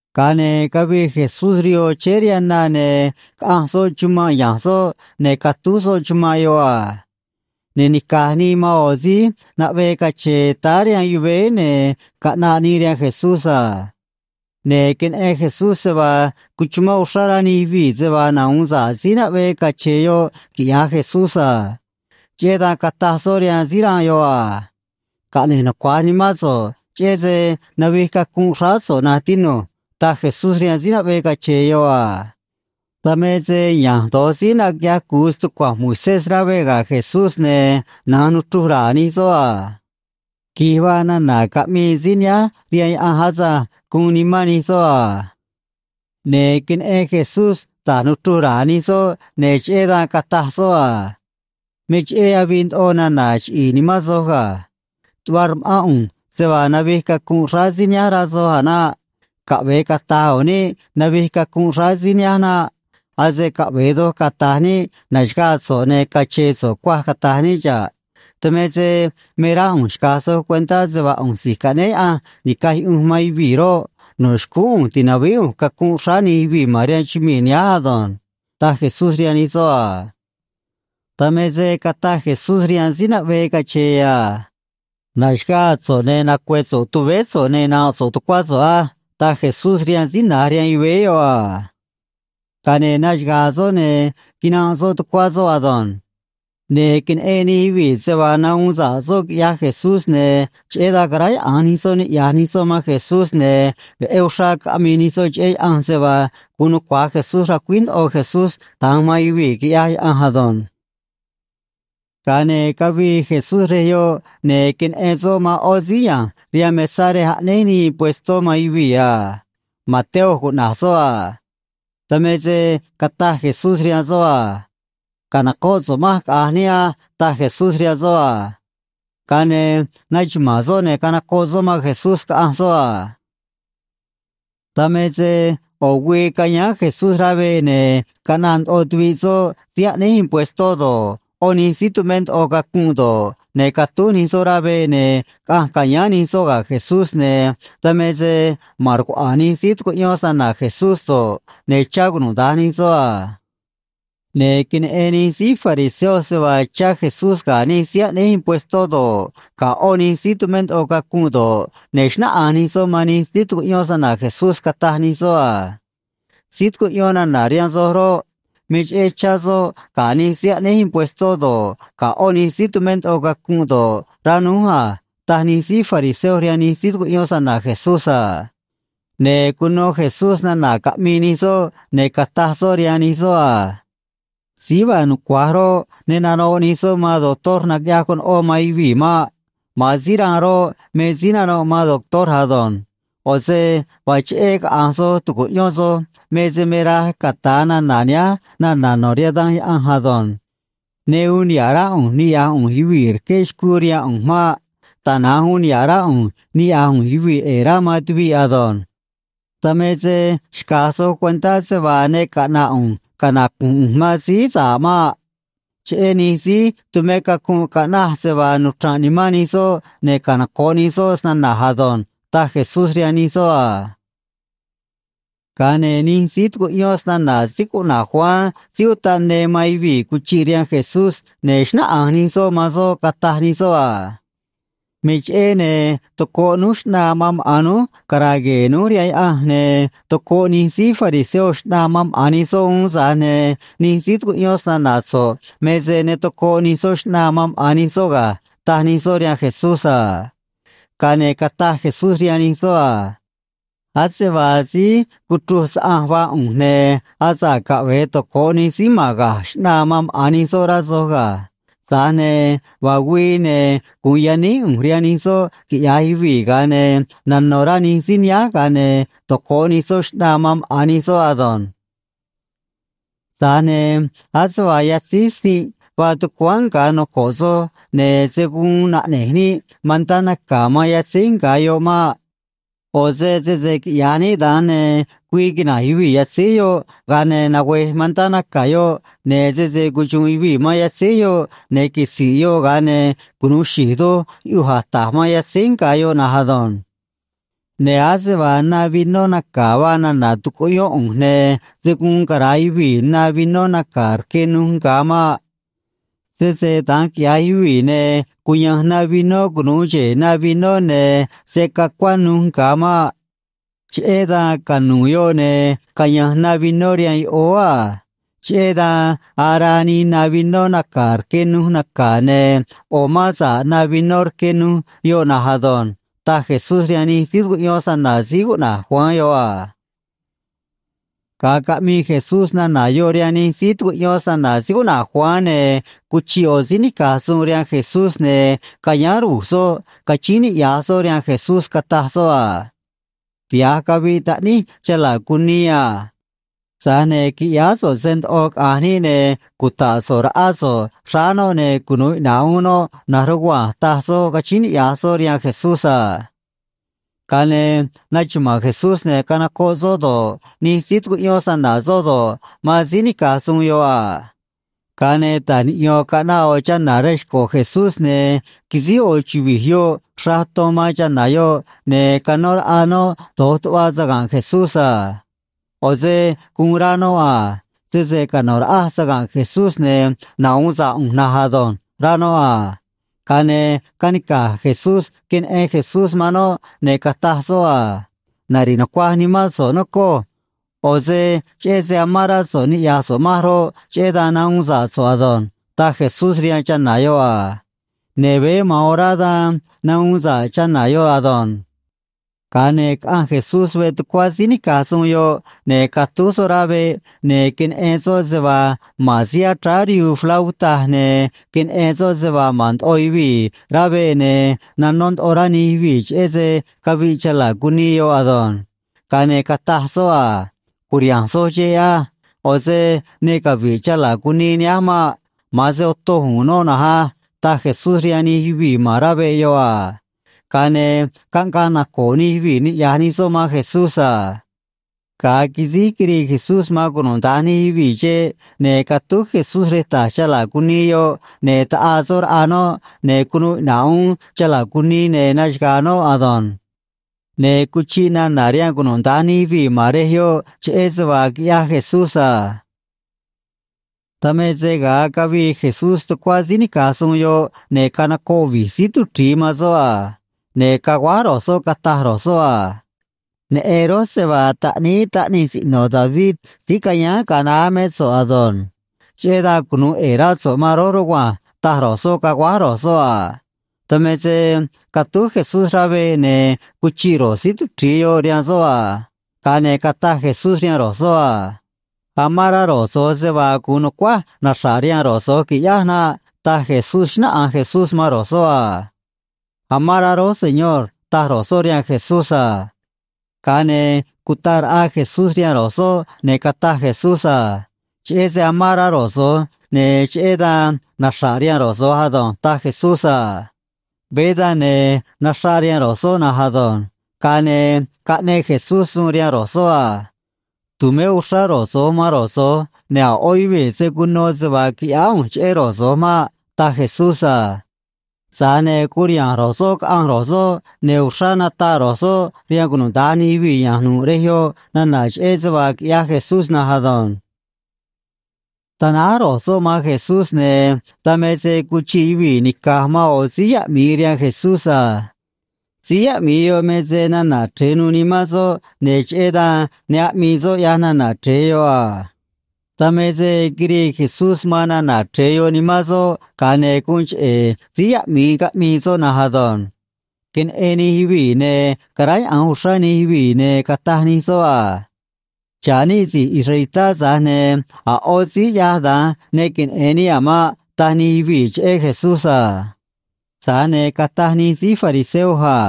Ga̱a ne̱ cavii Jesús rihoo chéé rihaan na, ne̱ caꞌanj soꞌ chumanꞌ ya̱nj soꞌ, ne̱ catúj soꞌ chumanꞌ yoꞌ a. Ne̱ nica̱j nii man ꞌo̱ síí naꞌvee cache̱e̱ táá rihaan yuvéé, ne̱ caꞌnaꞌ nii rihaan Jesús a. Ne̱ queneꞌen Jesús se vaa cuchumán uxrá rá nij yuvii̱ se vaa nahu̱un sa̱ꞌ síí naꞌvee cache̱e̱ yoꞌ quiꞌya̱j Jesús a. Cheꞌé dan cataj soꞌ rihaan síí ranꞌ yoꞌ a: ―Caꞌne̱j nucua̱j nimán so̱ꞌ cheꞌé se navij cacunꞌ xráá so̱ꞌ, na̱nj tinu̱j ―taj Jesús rihaan síí naꞌvee cache̱e̱ yoꞌ a. Dan me se ya̱nj do̱j síí naquiꞌyaj cu̱u stucua̱nj Moisés rá veꞌ ga̱ Jesús, ne̱ na̱nj nuchruj ra̱a̱ nij soꞌ a: “Qui̱j vaa nana̱ caꞌmii síí nihánj rihaan Yaꞌanj asânj”, guun nimán nij soꞌ a. Ne̱ queneꞌen Jesús da̱j nuchruj ra̱a̱ nij soꞌ, ne̱ cheꞌé dan cataj soꞌ a: ―Me cheꞌé avii ndoꞌo nana̱ chiꞌi̱i̱ nimán soj ga̱. Tuꞌva rma̱ꞌán ꞌu̱nj se vaa navij cacunꞌ xráá síí nihánj, rá soj a̱ naꞌ. Caꞌve̱e cata̱j u̱u̱n níꞌ navij cacunꞌ xráá síí nihánj naꞌ. Ase caꞌve̱e doj cata̱j níꞌ na̱xagaa soꞌ, ne̱ cache̱e̱ soꞌ cuaj, cata̱j níꞌ xa̱ꞌ. Dan me se me rá ꞌu̱nj xca̱j soj cuentá se vaa ꞌu̱nj Si̱j Caꞌnéé Yaꞌanj Ni̱caj Yuꞌunj man Yuvii̱ roꞌ, no̱ xcúún ꞌu̱nj ti̱navíí ꞌu̱nj cacunꞌ xráá nij yuvii̱ ma̱n rihaan chumii̱ nihánj ado̱nj ―taj Jesús rihaan nij soꞌ a. Dan me se cataj Jesús rihaan síí naꞌvee cache̱e̱ a: ―Na̱xaga̱a̱ so̱ꞌ, ne̱ nacue̱ so̱ꞌ tuvéé so̱ꞌ, ne̱ na̱nꞌ so̱ꞌ tucuá so̱ꞌ á ―taj Jesús rihaan síí na̱j rihaan yuvéé yoꞌ a. Ga̱a ne̱ naxaga̱a̱ soꞌ, ne̱ quinanꞌ soꞌ tucuá soꞌ ado̱nj. Ne̱ queneꞌen nij yuvii̱ se vaa nahuun sa̱ꞌ soꞌ, quiꞌyaj Jesús, ne̱ cheꞌé dan caráyaꞌa̱nj nij soꞌ, niꞌya̱j nij soꞌ man Jesús, ne̱ veꞌé uxrá caꞌmii nij soꞌ cheꞌé Yaꞌanj, se vaa guun nucua̱j Jesús racuíj ndoꞌo Jesús da̱nj man yuvii̱, quiꞌyaj Yaꞌanj ado̱nj. Ga̱a ne̱ cavii Jesús rej yoꞌ, ne̱ queneꞌen soꞌ man ꞌo̱ síí ya̱nj rihaan mesá rej aꞌnéj nii impuestó man yuvii̱ a. Mateo cuꞌna̱j soꞌ a. Dan me se cataj Jesús rihaan soꞌ a: ―Ca̱nocóꞌ so̱ꞌ manj, caꞌa̱nj níꞌ á ―taj Jesús rihaan soꞌ a. Ga̱a ne̱ naxuma̱a̱n soꞌ, ne̱ canocoꞌ soꞌ man Jesús, caꞌanj soꞌ a. Dan me se ꞌo̱ güii cayáán Jesús rá veꞌ, ne̱ caꞌnaꞌ ndoꞌo tuviꞌ soꞌ síí aꞌnéj impuestó do̱ꞌ, ꞌó nij síí tumé ndoꞌo cacunꞌ do̱ꞌ, ne̱ catúj nij soꞌ rá veꞌ, ne̱ caꞌanj ca̱yáán nij soꞌ ga̱ Jesús, ne̱ dan me se ma̱n rcuaꞌa̱a̱n nij síí tucuꞌyón snana̱ Jesús do̱ꞌ, ne̱ chá cunuda̱nj nij soꞌ a. Ne̱ queneꞌen nij síí fariseo se vaa chá Jesús ga̱ nij síí aꞌnéj impuestó do̱ꞌ, ga̱ ꞌó nij síí tumé ndoꞌo cacunꞌ do̱ꞌ, ne̱ xnáꞌanj nij soꞌ man nij síí tucuꞌyón snana̱ Jesús, cataj nij soꞌ a: ―Síí tucuꞌyón nana̱ rihaan soj roꞌ, me cheꞌé chá soꞌ ga̱ nij síí aꞌnéj impuestó do̱ꞌ, ga̱ ꞌó nij síí tumé ndoꞌo cacunꞌ do̱ꞌ, rá núj a ―taj nij síí fariseo rihaan nij síí tucuꞌyón snana̱ Jesús a. Ne̱ cuno Jesús nana̱ caꞌmii nij soꞌ, ne̱ cataj soꞌ rihaan nij soꞌ a: ―Síí vaa nucua̱j roꞌ, ne nanoꞌ nij soꞌ man doctor naquiꞌyaj conoꞌó man yuvii̱ maꞌ. Ma̱an síí ranꞌ roꞌ, me síí nanoꞌ man doctor ado̱nj. ꞌO̱ se vaa cheꞌé caꞌa̱nj soj tu̱cuꞌyón soj me se me raj cata̱a nana̱ nihánj nana̱ no̱ rihaan Danj Yaꞌanj ado̱nj: “Ne uun niha̱ꞌ rá ꞌu̱nj niꞌya̱j ꞌu̱nj yuvii̱ rqué xcuu rihaan ꞌu̱nj maꞌ. Tana̱nj uun niha̱ꞌ rá ꞌu̱nj niꞌya̱j ꞌu̱nj yuvii̱ ꞌe̱e̱ rá man tuviꞌ ado̱nj.” Dan me se xca̱j soj cuentá se vaa ne caꞌna̱ꞌ ꞌu̱nj canacu̱nj ꞌu̱nj man síí sa̱ꞌ maꞌ. Cheꞌé nij síí tumé cacunꞌ caꞌnaj se vaa nuchra̱nꞌ nimán nij soꞌ ne̱ canoco̱ꞌ nij soꞌ snana̱j ado̱nj ―taj Jesús rihaan nij soꞌ a. Ga̱a ne̱ nij síí tucuꞌyón snana̱ síí cuꞌna̱j Juan Síí Utaꞌ Ne man yuvii̱ cuchiꞌ rihaan Jesús, ne̱ xnáꞌanj nij soꞌ man soꞌ, cataj nij soꞌ a: ―Me cheꞌé, ne̱ tocoꞌ núj xꞌnaa man maꞌa̱n núj cara̱a̱ gue̱e̱ núj rihaan Yaꞌanj, ne̱ tocoꞌ nij síí fariseo xꞌnaa man maꞌa̱n nij soꞌ uún, tza̱j ne̱ nij síí tucuꞌyón snana̱ so̱ꞌ me se ne tocoꞌ nij soꞌ xꞌnaa man maꞌa̱n nij soꞌ ga̱ ―taj nij soꞌ rihaan Jesús a. Ga̱a ne̱ cataj Jesús rihaan nij soꞌ a: ―Ase vaa síí cuchruj saꞌanj vaa ꞌu̱nj, ne̱ asa̱ꞌ caꞌve̱e toco̱ꞌ nij síí ma̱n ga̱j xꞌnaa man maꞌa̱n nij soꞌ, rá soj ga̱. Tza̱j ne̱ vaa güii, ne̱ gu̱un yaníj ꞌu̱nj rihaan nij soꞌ quiꞌya̱j yuvii̱, ga̱a ne̱ nano̱ rá nij síí nihánj, ga̱a ne̱ toco̱ꞌ nij soꞌ xꞌnaa man maꞌa̱n nij soꞌ ado̱nj. ’Tza̱j ne̱ ase vaa yatzíj sinꞌ vaa tucuáán nga̱ noco̱ꞌ soj, ne̱ se̱ guun naꞌne̱j níꞌ mantá naca̱ man yatzíj nga̱ yoꞌ maꞌ. ꞌO̱ se sese quiꞌya̱j níꞌ da̱nj, ne̱ güii quina̱nj yuvii̱ yatzíj yoꞌ, ga̱a ne̱ nagüe̱j mantá naca̱ yoꞌ, ne̱ sese cuxu̱u̱n yuvii̱ man yatzíj yoꞌ, ne̱ quisi̱nꞌ yoꞌ, ga̱a ne̱ cunu̱u xi̱j doj yuꞌuj a̱j ta̱j man yatzíj nga̱ yoꞌ na̱nj ado̱nj. Ne̱ ase vaa na vinó naca̱ vaa nana̱ tucuꞌyón ꞌu̱nj, ne̱ se̱ guun cara̱a yuvii̱ na vinó naca̱ rque nuj nga̱ maꞌ. Sese da̱nj quiꞌya̱j yuvii̱, ne̱ cuya̱nj na vinó cunu̱u xe̱e̱ na vinó, ne̱ se̱ cacuá nuj nga̱ maꞌ. Cheꞌé dan canu̱u̱ yoꞌ, ne̱ caya̱nj na vinó rihaan yoꞌóó a. Cheꞌé dan araa nii na vinó naca̱ rque nuj naca̱, ne̱ ꞌo̱ mán sa̱ꞌ na vinó rque nuj yoꞌ na̱nj ado̱nj ―taj Jesús rihaan nij síí tucuꞌyón snana̱ síí cuꞌna̱j Juan yoꞌ a. Ga̱a caꞌmii Jesús nana̱ yoꞌ rihaan nij síí tucuꞌyón snana̱ síí cuꞌna̱j Juan, ne̱ cuchiꞌ ꞌo̱ síí nica̱j suun rihaan Jesús, ne̱ cayáán ru̱j soꞌ, cachíín niꞌya̱j soꞌ rihaan Jesús, cataj soꞌ a: ―Tiha̱j caviꞌ taꞌníj chala̱ cunii a. Tza̱j ne̱ qui̱ꞌyáá so̱ꞌ se ndoꞌo, caꞌa̱nj níꞌ, ne̱ cuta̱ꞌ so̱ꞌ raꞌá so̱ꞌ xráá noꞌ, ne̱ cunu̱u iꞌna̱ꞌ uún noꞌ na̱nj rugua̱nj ―taj soꞌ, cachíín niꞌya̱j soꞌ rihaan Jesús a. Ga̱a ne̱ naxuma̱a̱n Jesús, ne̱ canocoꞌ soꞌ do̱ꞌ, nij síí tucuꞌyón snana̱ soꞌ do̱ꞌ, man síí nica̱j suun yoꞌ a. Ga̱a ne̱ ta̱j niꞌyo̱n caꞌnaꞌ ꞌo̱ chana̱ rej xco̱ Jesús, ne̱ quisíj ꞌo̱ chuvi̱j yoꞌ xraꞌ ton man chana̱ yoꞌ, ne̱ canó raꞌa noꞌ do̱j tuꞌva saga̱nꞌ Jesús a. ꞌO̱ se guun rá noꞌ a: “Sese cano̱ raꞌaj saga̱nꞌ Jesús, ne̱ nahu̱un sa̱ꞌ ꞌu̱nj na̱nj ado̱nj”, rá noꞌ a. Ga̱a ne̱ canica̱j Jesús queneꞌen Jesús man noꞌ, ne̱ cataj soꞌ a: ―Nari̱ꞌ nucuaj nimán so̱ꞌ, nocoj. ꞌO̱ se cheꞌé se amán rá so̱ꞌ niꞌya̱j so̱ꞌ manj roꞌ, cheꞌé dan nahuun sa̱ꞌ so̱ꞌ ado̱nj ―taj Jesús rihaan chana̱ yoꞌ a. Ne̱ veé ma̱an orá dan nahuun sa̱ꞌ chana̱ yoꞌ ado̱nj. Ga̱a ne̱ caꞌanj Jesús veꞌ tucuá síí nica̱j suun yoꞌ, ne̱ catúj soꞌ rá veꞌ, ne̱ queneꞌen soꞌ se vaa ma̱n síí achráá rihuu flauta, ne̱ queneꞌen soꞌ se vaa ma̱n ndoꞌo yuvii̱ rá veꞌ, ne̱ nanó ndoꞌo rá nij yuvii̱ cheꞌé se caviꞌ chala̱ cunii yoꞌ ado̱nj. Ga̱a ne̱ cataj soꞌ a: ―Cu̱riha̱nj soj xeꞌ á. ꞌO̱ se ne cavi̱ꞌ chala̱ cunii nihánj maꞌ. Ma̱an se otoj u̱u̱n noꞌ na̱nj á ―taj Jesús rihaan nij yuvii̱ ma̱n rá veꞌ yoꞌ a. Ga̱a ne̱ caꞌngaꞌ naco̱o̱ nij yuvii̱ niꞌya̱j nij soꞌ man Jesús a. Ga̱a quisíj quirii Jesús man cunuda̱nj nij yuvii̱ xeꞌ, ne̱ catúj Jesús rej ta̱j chala̱ cunii yoꞌ, ne̱ taꞌaa soꞌ raꞌa noꞌ, ne̱ cunuu iꞌna̱ꞌ uún chala̱ cunii, ne̱ naxaga̱a̱ noꞌ ado̱nj. Ne̱ cuchiꞌ nana̱ rihaan cunuda̱nj nij yuvii̱ ma̱n rej yoꞌ cheꞌé se vaa quiꞌyaj Jesús a. Dan me se ga̱a cavii Jesús tucuá síí nica̱j suun yoꞌ, ne̱ canocoꞌ vi̱j síí tuchri̱i man soꞌ a. Ne̱ caguáj ro̱j soꞌ, cataj ro̱j soꞌ a: ―Neꞌen rój se vaa Taꞌníí Taꞌnij Siꞌno̱ David síí cayáán ga̱a naá mé so̱ꞌ ado̱nj. Cheꞌé dan cunu̱u ꞌe̱e̱ rá so̱ꞌ man rój rugua̱nj ―taj ro̱j soꞌ, caguáj ro̱j soꞌ a. Dan me se catúj Jesús rá veꞌ, ne̱ cuchiꞌ ro̱j síí tuchri̱i yoꞌ rihaan soꞌ a. Ga̱a ne̱ cataj Jesús rihaan ro̱j soꞌ a: ―Amán rá ro̱j so̱j se vaa gu̱un nu̱cuáj naxra̱ꞌ rihaan ro̱j so̱j qui̱ꞌyáj naꞌ ―taj Jesús, xnáꞌanj Jesús man ro̱j soꞌ a. ―Amán rá rój, Señor ―taj ro̱j soꞌ rihaan Jesús a. Ga̱a ne̱ cutaꞌ raꞌa Jesús rihaan ro̱j soꞌ, ne̱ cataj Jesús a: ―Cheꞌé se amán rá ro̱j so̱j, ne̱ cheꞌé dan naxra̱ꞌ rihaan ro̱j so̱j ado̱nj ―taj Jesús a. Veé dan, ne̱ naxraꞌ rihaan ro̱j soꞌ na̱nj ado̱nj. Ga̱a ne̱ caꞌneꞌ Jesús suun rihaan ro̱j soꞌ a: ―Tu̱mé uxrá ro̱j so̱j man ro̱j so̱j, ne̱ a̱ ꞌó yuvii̱ se̱ cuno se vaa quiꞌyáá ꞌu̱nj cheꞌé ro̱j so̱j maꞌ ―taj Jesús a. Tza̱j ne̱ curiha̱nj ro̱j soꞌ caꞌanj ro̱j soꞌ, ne̱ uxrá nataꞌ ro̱j soꞌ rihaan cunuda̱nj nij yuvii̱ ya̱nj nu̱ꞌ rej yoꞌ nana̱ cheꞌé se vaa quiꞌyaj Jesús na̱nj ado̱nj. Tanáj ro̱j soꞌ man Jesús, ne̱ dan me se cuchiꞌ yuvii̱ nica̱j man ꞌo̱ síí yaꞌmi̱i rihaan Jesús a. Síí yaꞌmi̱i yoꞌ me se nana̱ chre̱e nuû nimán soꞌ, ne̱ cheꞌé dan ne aꞌmii soꞌ, ꞌyaj nana̱ chre̱e yoꞌ a. Dan me se quirii Jesús man nana̱ chre̱e yoꞌ nimán soꞌ, ga̱a ne̱ guun cheꞌe̱ síí yaꞌmi̱i caꞌmii soꞌ na̱nj ado̱nj. Queneꞌen nij yuvii̱, ne̱ caráyaꞌa̱nj uxrá nij yuvii̱, ne̱ cataj nij soꞌ a: ―Xa̱ꞌ níꞌ si̱j israelitá, tza̱j ne̱ a̱ ꞌó síí ꞌyaj da̱nj ne queneꞌe̱n níꞌ a̱ maꞌ ―taj nij yuvii̱ cheꞌé Jesús a. Tza̱j ne̱ cataj nij síí fariseo a: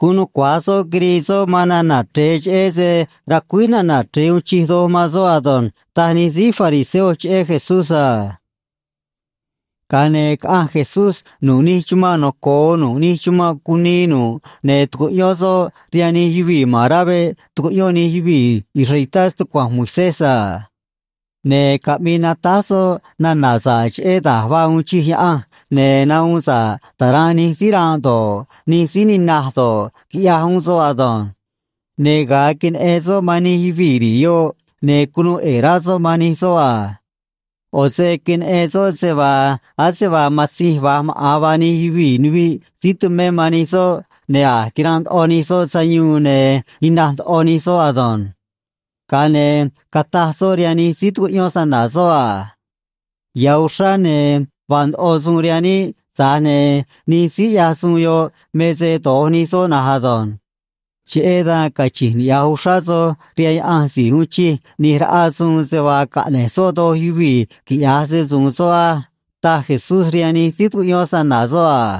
―Guun nucua̱j soꞌ quirii soꞌ man nana̱ chre̱e, cheꞌé se racuíj nana̱ chre̱e uun chij doj man soꞌ ado̱nj ―taj nij síí fariseo cheꞌé Jesús a. Ga̱a ne̱ caꞌanj Jesús nu̱ꞌ nij chumanꞌ noco̱o nu̱ꞌ nij chumanꞌ cunii nu̱ꞌ, ne̱ tucuꞌyón soꞌ rihaan nij yuvii̱ ma̱n rá veꞌ tucuꞌyón nij yuvii̱ israelitá stucua̱nj Moisés a. Ne̱ caꞌmii natáj soꞌ nana̱ sa̱ꞌ cheꞌé da̱j vaa uun chij Yaꞌanj, ne̱ nahuun sa̱ꞌ ta̱ranꞌ nij síí ranꞌ do̱ꞌ, nij síí ninaj do̱ꞌ, quiꞌyaj uún soꞌ ado̱nj. Ne̱ ga̱a queneꞌen soꞌ man nij yuvii̱ ri̱i̱ yoꞌ, ne̱ cunuu ꞌe̱e̱ rá soꞌ man nij soꞌ a. ꞌO̱ se queneꞌen soꞌ se vaa ase vaa matzinj va̱j maꞌa̱n vaa nij yuvii̱, nuviꞌ síí tumé man nij soꞌ, ne̱ a̱j quiranꞌ ndoꞌo nij soꞌ sayuun, ne̱ ninaj ndoꞌo nij soꞌ ado̱nj. Ga̱a ne̱ cataj soꞌ rihaan nij síí tucuꞌyón snana̱ soꞌ a: ―Ya̱ uxrá, ne̱ vaa ndoꞌo suun rihaan níꞌ, tza̱j ne̱ nij síí ꞌyaj suun yoꞌ me se do̱j nij soꞌ na̱nj ado̱nj. Cheꞌé dan cachi̱nj niꞌya̱j uxrá soj rihaan Yaꞌanj si̱j uun chij ꞌni̱j raꞌa suun se vaa caꞌne̱j soꞌ doj yuvii̱ quiꞌya̱j se‑su̱u̱n soꞌ á ―taj Jesús rihaan nij síí tucuꞌyón snana̱ soꞌ a.